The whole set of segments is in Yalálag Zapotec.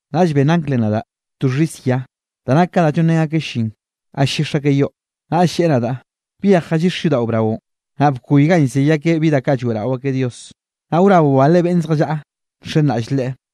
Naꞌll benn anglenꞌ nadaꞌ to xhis yia da nak ka da llonrén akeꞌ llin ga ll-llix akeꞌ yo, naꞌll lleꞌe nadaꞌ: —Byej jallixe yodaꞌo braonꞌ, naꞌ bkoy ganꞌ llzey akeꞌ bi da lloeꞌrao akeꞌ Dios, naꞌ wraboꞌ bale beꞌnn zjallaꞌa nxenraꞌll Leꞌe.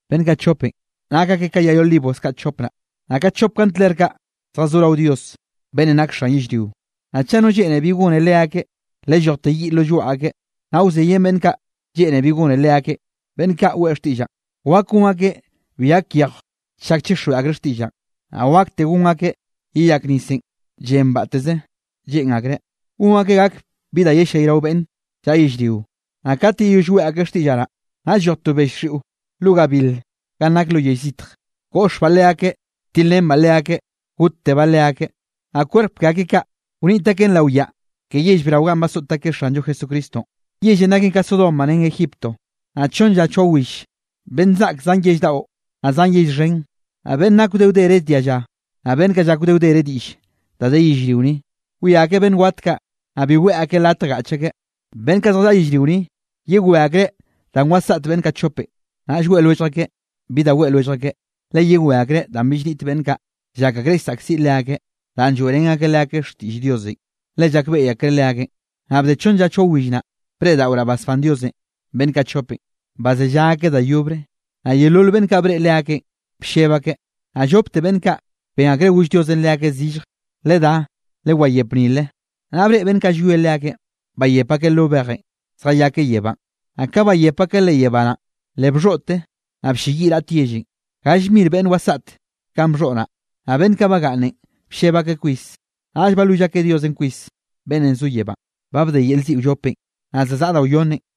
Beꞌnn kaꞌ chopenꞌ nak akeꞌ ka yay olivos kaꞌ chope naꞌ, naꞌ ka chop kandler kaꞌ zjazó rao Dios, beꞌnnenꞌ nake xan yellrio. Naꞌ chaꞌ no lleꞌne bi gonre leakeꞌ, le llojte yiꞌ lo lloaꞌ akeꞌ, naꞌ wzeyen beꞌnn kaꞌ lleꞌne bi gone leakeꞌ. Beꞌnn kaꞌ weꞌe xtiꞌllaꞌn, wak gon akeꞌ bi gak yejw chak chixjweꞌ akreꞌ xtiꞌllaꞌn, naꞌ wakte gon akeꞌ yeyak nisenꞌ llen batteze lleꞌn akreꞌ, gon akeꞌ gak bi da yellayrao beꞌnn llaꞌa yellrio. Naꞌ kat yeyoll weꞌe akeꞌ xtiꞌllaꞌ naꞌ, naꞌll lloj to bell xiꞌo lo gabil ganꞌ nake lo yell zitj, goꞌxbaꞌ leakeꞌ, tilrenbaꞌ leakeꞌ, gottebaꞌ leakeꞌ. Naꞌ kwerp ke akeꞌ kaꞌ, wniꞌt akeꞌn lao yaꞌa ke yell brao ganꞌ basoꞌt akeꞌ Xanllo Jesucristonꞌ. Yellenꞌ naken ka Sodoma ren Egipto. Naꞌ chonn lla choa will beꞌnn zaꞌk zan yell daꞌo, naꞌ zan yell xhen, naꞌ beꞌnn nak wde wdere dialla, naꞌ beꞌnn kaꞌ llak wde wdere diꞌll da de yellrio ni, wia akeꞌ beꞌnn wat kaꞌ, naꞌ bi weꞌe akeꞌ latj gaꞌch akeꞌ. Beꞌnn kaꞌ zjallaꞌa yellrio ni, yewé akreꞌ danꞌ wasaꞌt beꞌnn kaꞌ chope, naꞌll weꞌe lwellj akeꞌ bi da weꞌe lwellj akeꞌ, le yewé akreꞌ danꞌ bill niꞌt beꞌnn kaꞌ llak akreꞌ llsaꞌkziꞌ leakeꞌ danꞌ lloeꞌrén akeꞌ leakeꞌ xtiꞌll Diosenꞌ, le llakbeꞌy akreꞌ leakeꞌn. Naꞌ bde chonn lla choa will naꞌ, breꞌdaꞌoraꞌ basbán Diosenꞌ beꞌnn kaꞌ chopenꞌ, bazellá akeꞌ da yobre, naꞌ yeolol beꞌnn kaꞌ breꞌe leakeꞌn, blleb akeꞌ. Naꞌ llopte beꞌnn kaꞌ ben akreꞌ goll Diosenꞌ leakeꞌ zillje: —Ledá, lewayep nile. Naꞌ breꞌe beꞌnn kaꞌ llwie leakeꞌn, bayep akeꞌ lo bejenꞌ, zjayakeꞌ yebánꞌ. Naꞌ ka bayep akeꞌ leꞌ yebá naꞌn, le bxhoꞌte, naꞌ blleyiꞌ raꞌt yellenꞌ, gall mir beꞌnn wasaꞌt kanꞌ bxhoꞌ naꞌ. Naꞌ beꞌnn kaꞌ bagaꞌnnenꞌ blleb akeꞌ kwis, naꞌll balwill akeꞌ Diosenꞌ kwis, beꞌnnenꞌ zo yebánꞌ. Ba bde yel ziꞌ wllopenꞌ, naꞌ za zaꞌa da wyonnenꞌ.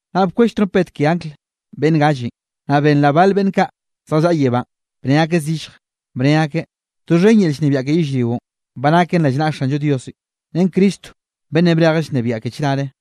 Naꞌ bkwell trompet ke angl beꞌnn gallenꞌ, naꞌ benraꞌ bal beꞌnn kaꞌ zjallaꞌa yebánꞌ, bnne akeꞌ zillje, bne akeꞌ: Doxhen yel llnebiaꞌ ke yellrionꞌ, ba naken rao naꞌa Xanllo Diosenꞌ, ren Cristo beꞌnnenꞌ brejeꞌ llnebiaꞌ ke chnare.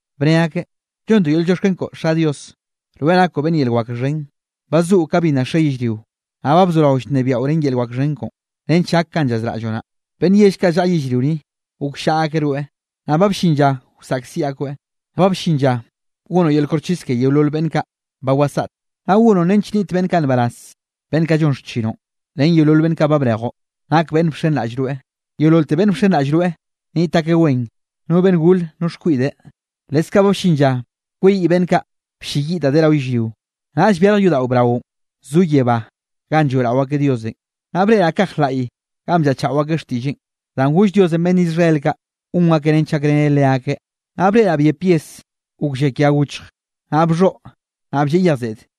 bne akeꞌ: Llontoꞌ yel llioxken koꞌo Xa Dios, rweꞌ nakoꞌ beꞌnn yel wak xhen. Ba zoꞌo ka bi nna xe yellrio, naꞌ ba bzorao llnebiaꞌo ren yel wak xhen koꞌo, nench gak kanꞌ llazraꞌlloꞌ naꞌ. Beꞌnn yell kaꞌ llaꞌa yellrio ni, gokllaꞌa akeꞌ rweꞌ. Naꞌ ba bllin lla wsaꞌkziꞌ akoeꞌ. Ba bllin lla gonoꞌ yel koxchis ke yeolol beꞌnn kaꞌ ba wasaꞌte. Naꞌ gonoꞌ nench nniꞌt beꞌnn kaꞌ nbaraz, beꞌnn kaꞌ llon xchinoꞌn, ren yeolol beꞌnn kaꞌ brejoꞌ nak beꞌnn bxenraꞌll rweꞌ. Yeololte beꞌnn bxenraꞌll rweꞌ nniꞌt akeꞌ wen, no beꞌnn gore no xkwiꞌde. Leskaꞌ ba bllin lla kweyiꞌ beꞌnn kaꞌ blleyiꞌ da de rao yellrio. Naꞌll byarj yodaꞌo braonꞌ zo yebá ganꞌ lloeꞌrao akeꞌ Diosenꞌ, naꞌ breꞌraꞌ kaj laꞌy ganꞌ bllaꞌchaꞌo akeꞌ xtiꞌlleꞌn, danꞌ goll Diosenꞌ beꞌnn Israel kaꞌ gon akeꞌ nench gakreneꞌ leakeꞌ. Naꞌ breꞌraꞌn byep yes, gok llakia gochj, naꞌ bxhoꞌ naꞌ blleꞌ yej seꞌde.